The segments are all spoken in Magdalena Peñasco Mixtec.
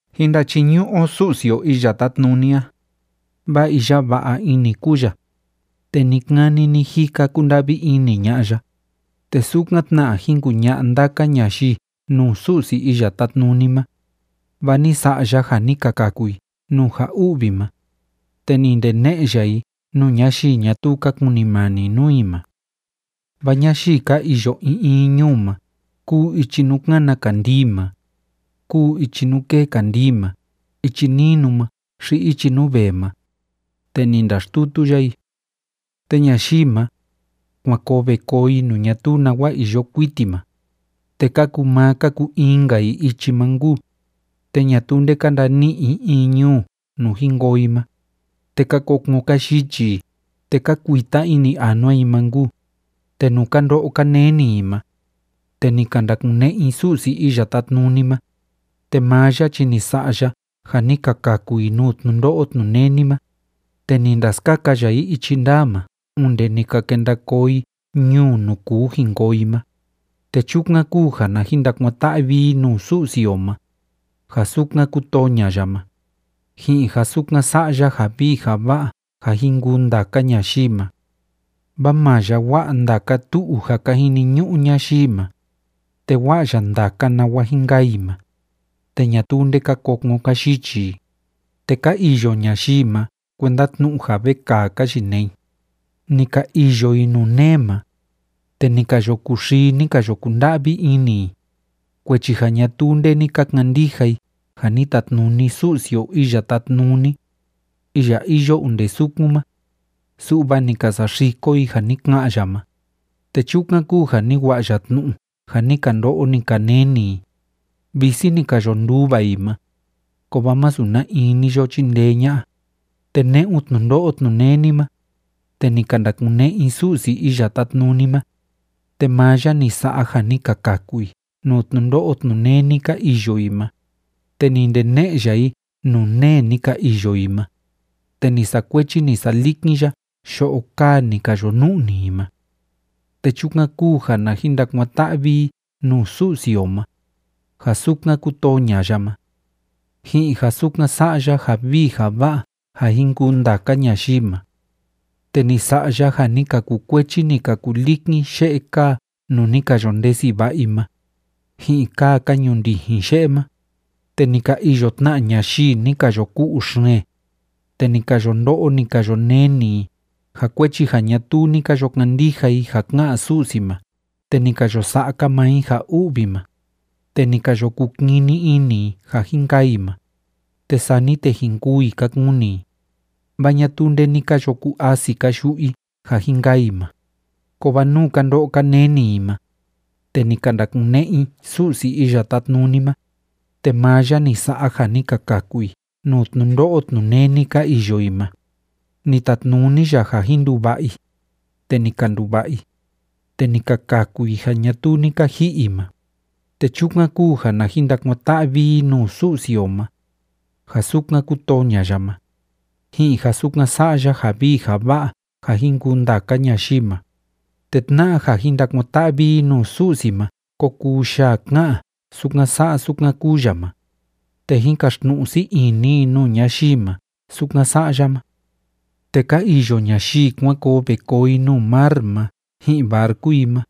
Jín ndachiñu'u o Su'si o Iya Tátnuni a, vaa iya va'a ini kúu ya, te ni‑kani ni‑jika kúnda'vi ini ña'a ya. Te sukan tna jín kuña'a ndaka ñayii nuu Su'si Iya Tátnuni ma, vaa ni sa'a ya ja ni ka kaku i nuu ja u'vi ma, te ni ndene'e ya i nuu ñayii ñatuu ka kunimani nuu i ma. Vaa ñayii ka iyo in in ñuu ma, kúu ichi nuu kána kandii ma, kúu ichi nuu kée kandii ma, ichi ninu ma xi ichi nuu vee ma, te ni ndaxtutu ya i. Te ñayii ma, kuan koo ve koo i nuu ñatuu nawa iyo kuiti ma, te ka kuu maa ka kuu in‑nka i ichi ma nkuu, te ñatuu nde ka ndani'i i in ñuu nuu jin koo i ma. Te ka kokon ka yichi i, te ka kuita ini anua i ma nkuu. Te nuu ka ndo'o ka neni i ma, te ni ka ndakune'e i Su'si Iya Tátnuni ma, te maa ya chi ni sa'a ya ja ni ka kaku i nuu tnundo'o tnuneni ma. Te ni ndaskaka ya i ichi ndaa ma onde ni ka kenda koo i ñuu nuu kuu jin koo i ma. Te chukan kúu ja na jin ndakuan‑ta'vi i nuu Su'si o ma, ja sukan kútoo ña'a ya ma, ji'in ja sukan sa'a ya ja vii ja va'a ja jin kuu ndaka ñayii ma. Vaa maa ya wa'a ndaka tu'u ja ka jiniñu'u ñayii ma, te wa'a ya ndaka nawa jin kaa i ma, te ñatuu nde ka kokon ka yichi i. Te ka iyo ñayii ma kuenda tnu'u ja vekaa ka yinee i, ni ka iyo i nuu nee ma, te ni ka yo kuxii, ni ka yo kunda'vi ini i, kuechi ja ñatuu nde ni ka kandija i ja ni tatnuni Su'si o Iya Tátnuni, iya iyo onde sukun ma, su'va ni ka saxiko i ja ni ka'an ya ma. Te chukan kúu ja ni wa'a ya tnu'u ja ni ka ndo'o, ni ka neni i. Visi ni ka yo nduva i ma, kovaa masu na in ni yo chindee ña'a. Te ne'un tnundo'o tnuneni ma, te ni ka ndakune'e i Su'si Iya Tátnuni ma, te maa ya ni sa'a ja ni ka kaku i nuu tnundo'o tnuneni ka iyo i ma. Te ni ndene'e ya i nuu nee ni ka iyo i ma, te ni sakuechi, ni salikin ya yo'o kaa ni ka yo nu'ni i ma. Te chukan kúu ja na jin ndakuan‑ta'vi i nuu Su'si o ma, ja sukan kútoo ña'a ya ma, ji'in ja sukan sa'a ya ja vii ja va'a ja jin kuu ndaka ñayii ma. Te ni sa'a ya ja ni ka kukuechi, ni ka kulikin ye'e kaa nuu ni ka yo ndesi va'a i ma, ji'in kaa ka ñundijin ye'e ma. Te ni ka iyo tna ñayii ni ka yo ku'u xeen, te ni ka yo ndo'o, ni ka yo neni i, ja kuechi ja ñatuu ni ka yo kandija i ja ká'an Su'si ma te ni ka yo sa'a‑ka maa i ja u'vi ma. Te ni ka yo kukini ini i ja jin kaa i ma, te sani te jin kûu i ka kuni i, vaa ñatuu nde ni ka yo ku‑asi‑ka yu'u i ja jin kaa i ma. Kovaa nuu ka ndo'o ka neni i ma, te ni ka ndakune'e i Su'si Iya Tátnuni ma. Te maa ya ni sa'a ja ni ka kaku i nuu tnundo'o tnuneni ka iyo i ma. Ni tatnuni ya ja jin nduva'a i, te ni ka nduva'a i, te ni ka kaku i ja ñatuu ni ka ji'i i ma. Te chukan kúu ja na jin ndakuan‑ta'vi i nuu Su'si o ma, ja sukan kútoo ña'a ya ma, ji'in ja sukan sa'a ya ja vii ja va'a ja jin kuu ndaka ñayii ma. Te tna'a ja jin ndakuan‑ta'vi i nuu Su'si ma ko kuu yaa ja ká'an sukan sa'a sukan kúu ya ma, te jín kaxtnu'u sii ini i nuu ñayii ma sukan sa'a ya ma. Te ka iyo ñayii kuan koo ve koo i nuu mar ma ji'in barcu i ma,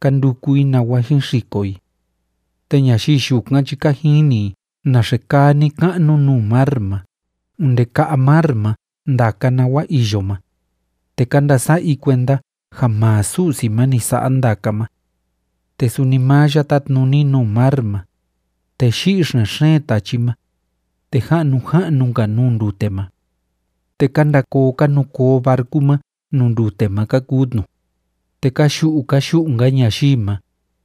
ka nduku i nawa jin xiko i. Te ñayii yukan chi ka jini i naxe kaa ni‑ka'nu nuu mar ma onde ka'a mar ma ndaka nawa iyo ma, te ka ndasa'a i kuenda ja maa Su'si ma ni sa'a ndaka ma. Te suni maa ya tátnuni nuu mar ma, te yi'i xen‑xeen tachi ma, te ja'nu ja'nu‑nka nuu ndute ma. Te ka nda koo ka nu koo barcu ma nuu ndute ma ka kuu tnu, te ka yu'u ka yu'u‑nka ñayii ma,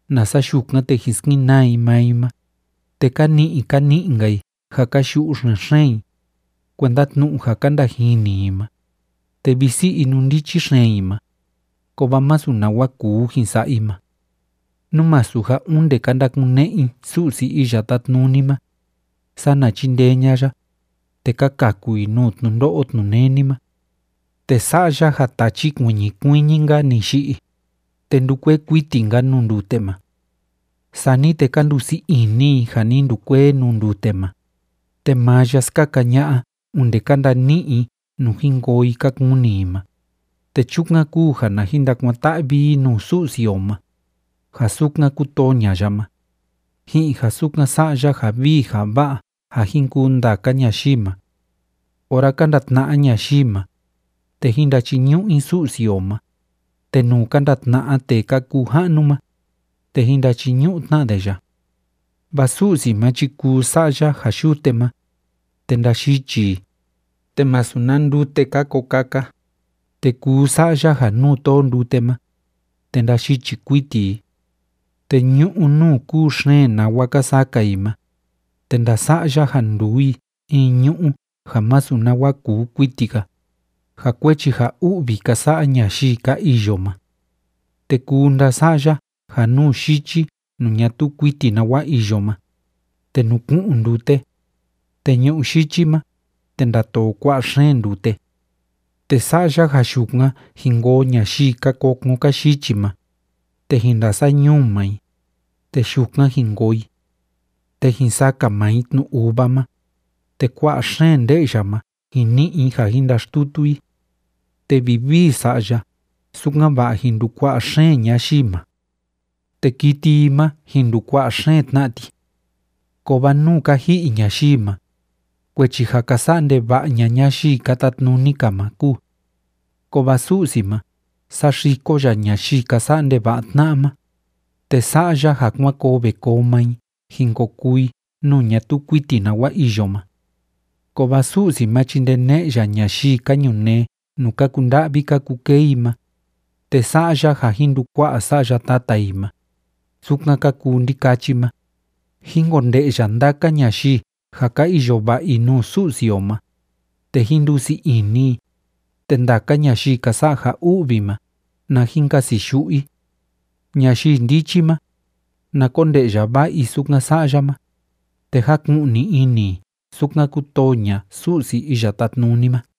nasa yukan, te jin skenaa i maa i ma. Te ka ni'i ka ni'i‑nka i ja ka yu'u xen‑xeen i, kuenda tnu'u ja ka ndajini i ma, te visi inundichi xeen i ma, kovaa masu nawa kúu jin sa'a i ma. Nú masu ja onde ka ndakune'e i Su'si Iya Tátnuni ma, sana chíndee ña'a ya, te ka kaku i nuu tnundo'o tnuneni ma. Te sa'a ya ja tachi kuiñi kuiñi‑nka ni yi'i, te ndúkuee kuiti‑nka‑ni nuu ndute ma. Sani te ka ndusii ini i ja ni ndukuee nuu ndute ma, te maa ya skaka ña'a onde ka ndani'i i nuu jin koo i ka kuni i ma. Te chukan kúu ja na jin ndakuan‑ta'vi i nuu Su'si o ma, ja sukan kútoo ña'a ya ma, ji'in ja sukan sa'a ya ja vii ja va'a ja jin kuu ndaka ñayii ma. Ora ka ndatna'a ñayii ma, te jín ndachiñu'u i Su'si o ma, te nuu ka ndatna'a tee ka kuu ja'nu ma, te jín ndachiñu'u tna de ya. Vaa Su'si ma chi kuu sa'a ya ja yute ma, te ndayichi i, te masu na ndute‑ka ko kaka, te kuu sa'a ya ja nuu tóo ndute ma, te ndayichi kuiti i. Te ñu'ú nuu kúu xeen nawa ka saka i ma, te ndasa'a ya ja nduu i in ñu'ú ja masu nawa kuu kuiti‑ka, ja kuechi ja u'vi ka sa'a ñayii ka iyo ma. Te kuu ndasa'a ya ja nuu yichi nuu ñatuu kuiti nawa iyo ma, te nuku'un ndute, te ñu'ú yichi ma, te ndatoo kua'a xeen ndute. Te sa'a ya ja yukan jin koo ñayii ka kokon ka yichi ma, te jin ndasañuu maa i, te yukan jin koo i. Te jin saka maa i tnu uva ma, te kua'a xeen nde'ya ma jin ni'i i ja jin ndaxtutu i. Te vivii sa'a ya, sukan‑va'a jin ndukua'a xeen ñayii ma. Te kiti i ma, jín ndukua'a xeen tna ti. Kovaa nú ka ji'i ñayii ma, kuechi ja ka sa'a ndeva'a ña'a ñayii ka tatnuni‑ka ma kúu. Kovaa Su'si ma, saxiko ya ñayii ka sa'a ndeva'a tna'a ma, te sa'a ya ja kuan koo ve koo maa i jin ko kuu i nuu ñatuu kuiti nawa iyo ma. Kovaa Su'si ma chi ndene'e ya ñayii ka ñunee nuu ka kunda'vi ka kukee i ma, te sa'a ya ja jin ndukua'a sa'ya tata i ma, sukan ka kuu ndikachi ma. Jín konde'ya ndaka ñayii ja ka iyo va'a i nuu Su'si o ma, te jín ndusii ini i, te ndaka ñayii ka sa'a ja u'vi ma, na jin kasiyu'u i. Ñayii ndichi ma, na konde'ya va'a i sukan sa'a ya ma, te jáku'ni ini i sukan kútoo ña'a Su'si Iya Tátnuni ma.